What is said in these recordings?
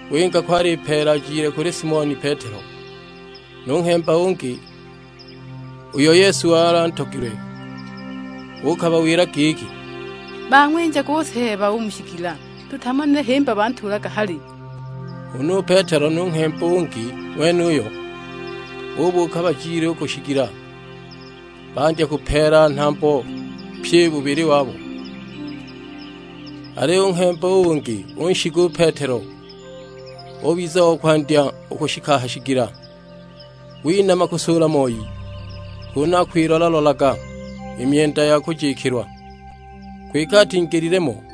Winga ko alipeela ajile kuli Simoni Petelo nu nghemba u ungi, uyo Yesu wali antogilwe. Uukabawila giki, "Bang'winjaga u Seeba u mu shigila, tutamanile himba bantuulaga hali!" Huna u Petelo nu nghemba u ungi ng'wenuyo, bubuuka bajile u ku shigila. Bandya kupeela nhambo pyi bubili wabo. Aliyo u nghemba u ungi unshiga u Petelo, ubiza o kwandya u kushika a ha shigila. Winama kusuula moi, kunu akwilola-lolaga i myenda ya kujikilwa; kwike atingilile mo.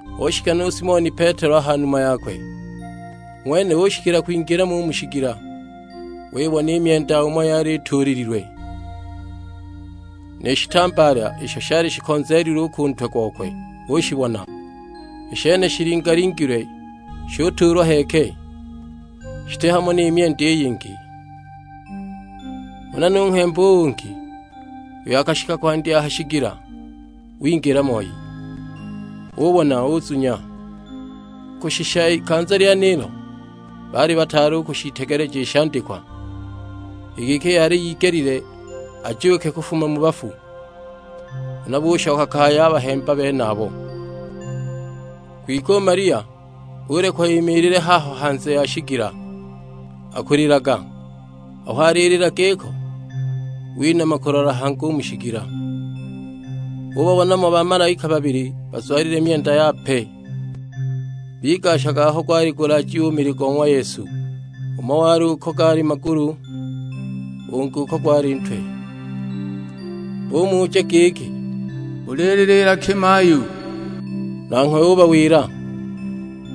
Ushika nu Simoni Petelo a ha numa yakwe, u ng'wene ushikila kwingila mo u mu shigila; wibona i myenda umo yali ituulililwe. Ni shitambaala isho shali shikonzeelilwe u ku ntwe gokwe ushibona; i shene shilinga-lingilwe shutuulwa heeke, shiti hamo ni myenda i yingi. Huna nu nghemba u ungi, uyo akashika kwandya a ha shigila, wingila moi; ubona uzunya. Kushisha ikanza lyenilo baali bataali u kushiitegeleja i shandikwa: i giki yali yigelile ajuuke kufuma mu bafu. Huna bushoka kaya a bahemba benabo. Kwike u Malia ulekwa imiilile haho hanze ya shigila akulilaga. Aho alilila giko, winama kulola hangi u mu shigila. Ubabona mo bamalaika babili bazwalile myenda yape, bigashaga aho gwali gulaajiwe u mili go ng'wa ''Yesu: umo wali uko gaali magulu, ungi uko gwali ntwe. Bumuja giki, "Ulililiila ki mayu?" Nanghwe ubawila,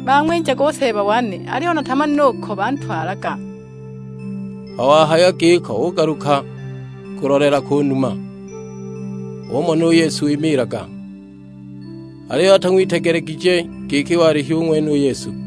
"Bang'winjaga u Seeba wane, aliyo natamanile uko bantwalaga!" Aho wahaya giko ugaluka kulolela ku numa, umona u Yesu wimiilaga, aliyo atang'witegelegije giki wali hu ng'wene u Yesu.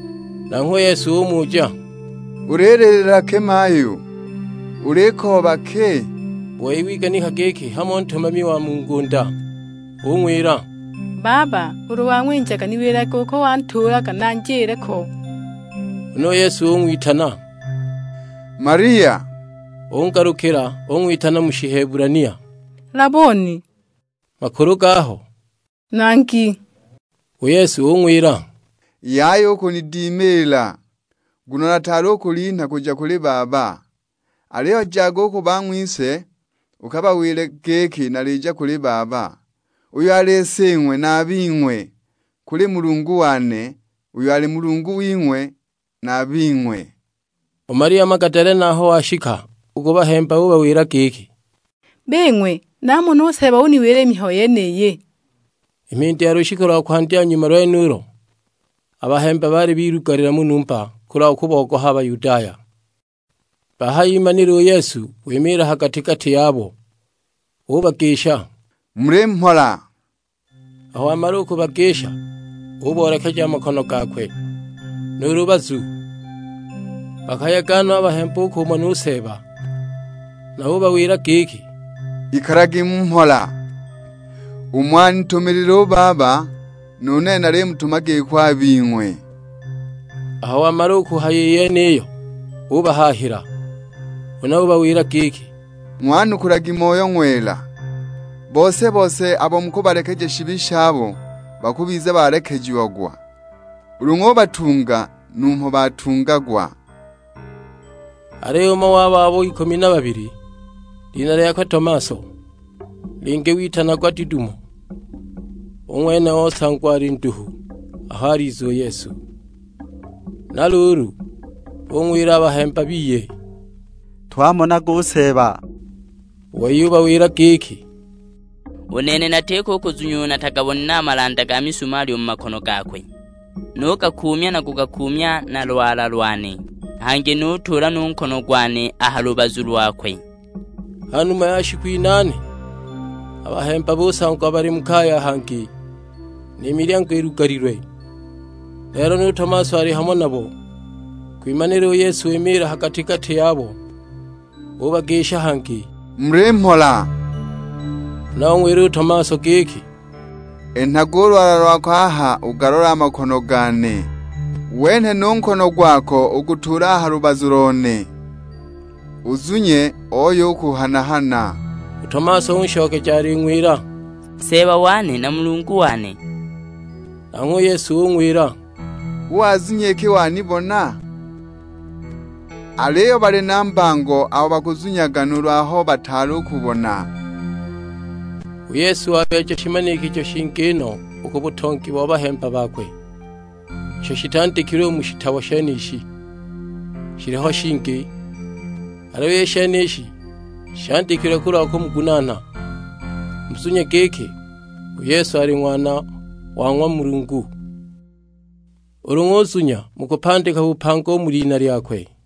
Nanghwe Yesu umuja, "Ulililiila ki mayu? Ulikooba ki?" U wei wiganika giki hamo ntumami wa mu ngunda. Ung'wila, "Baba ulu wang'winjaga niwilage uko wantuulaga, nanjile ko!" Huna u Yesu ung'witana, "Malia!" Ungalukila ung'witana mu Shihebulania, "Laboni!" (makulu gaho, "Nangi!") U Yesu ung'wila, "Yaya u kunidimiila, nguno nataali u kulinha kuja kuli Baba. Aliyo jaga u ku bang'wise, ukabawile giki nalija kuli Baba, uyo ali Sing'we na a bing'we; kuli Mulungu wane, uyo ali Mulungu wing'we na a bing'we." U Malia Magadalena aho washika u ku bahemba ubawila giki, "Bing'we, namona u Seeba uniwila i mihayo yeniyi!" I mhindi ya lushiku lwa kwandya nyuma lwenulo, a bahemba baali bilugalila mu numba, kulwa kubogoha Bayudaya. Bahayimanila u Yesu wimiila ha gati-gati yabo; ubagisha, "Muli mhola!" Aho wamala u kubagisha uboolekeja a makono gakwe, nu lubazu. Bakayega no a bahemba u kumona u Seeba. Na ubawila giki, "Ikalagi mu mhola; umo anitumilile u Baba nu nene nalimutuma giko a bing'we." Aho wamala u kuhaya i yeniyo ubahaahila; huna ubawila giki, "Ng'wanukulagi Moyo Ng'wela. Bose-bose abo mukubalekeja shibi shabo bakubiza balekejiagwa, ulu ng'ubatunga numho batungagwa." Aliyo umo wabo abo ikumi na babili, lina lyakwe Tomaso, lina lingi witanagwa Didumo, u ng'wene osangwa alinduhu aho aliza u Yesu. Na luulu bung'wila a bahemba biye, "Twamonaga u Seeba," u wei ubawila giki, "U nene natiko u kuzunya ulu natagabonile a malanda ga mizumali u mu makono gakwe, nugakuumya na kugakuumya na lwala lone; hangi nutuula nu nkono gwane a ha lubazu lokwe!" Ha numa ya shiku inaane, a bahemba busangwa bali mu kaya hangi, ni milyango ilugalilwe, lelo nu Tomaso ali hamo nabo; kwimanila u Yesu wimiila ha gati-gati yabo: ubagisha hangi, "Muli mhola!" Huna ung'wila u Tomaso giki, "Enhaga u lwala lwako aha ugalole a makono gane, wenhe nu nkono gwako ugutuule a ha lubazu lone, uzunye ooye u kuhana-hana." U Tomaso unshokeja aling'wila, "Seeba wane na Mulungu wane!" Nanghwe u Yesu ung'wila, "Hu wazunya iki wanibona? Aliyo bali na mbango abo bakazunyaga nuulu aho bataali u kubona." U Yesu wabeeja shimanikijo shingi no u ku butongi bo bahemba bakwe. Isho shitandikilwe u mu shitabo shenishi, shiliho shingi. Aliyo i shenishi shandikilwe kulwa kumugunaana, muzunye giki u Yesu ali Ng'wana wa ng'wa Mulungu, ulu ng'uzunya mukupandika bupanga u mu lina lyakwe.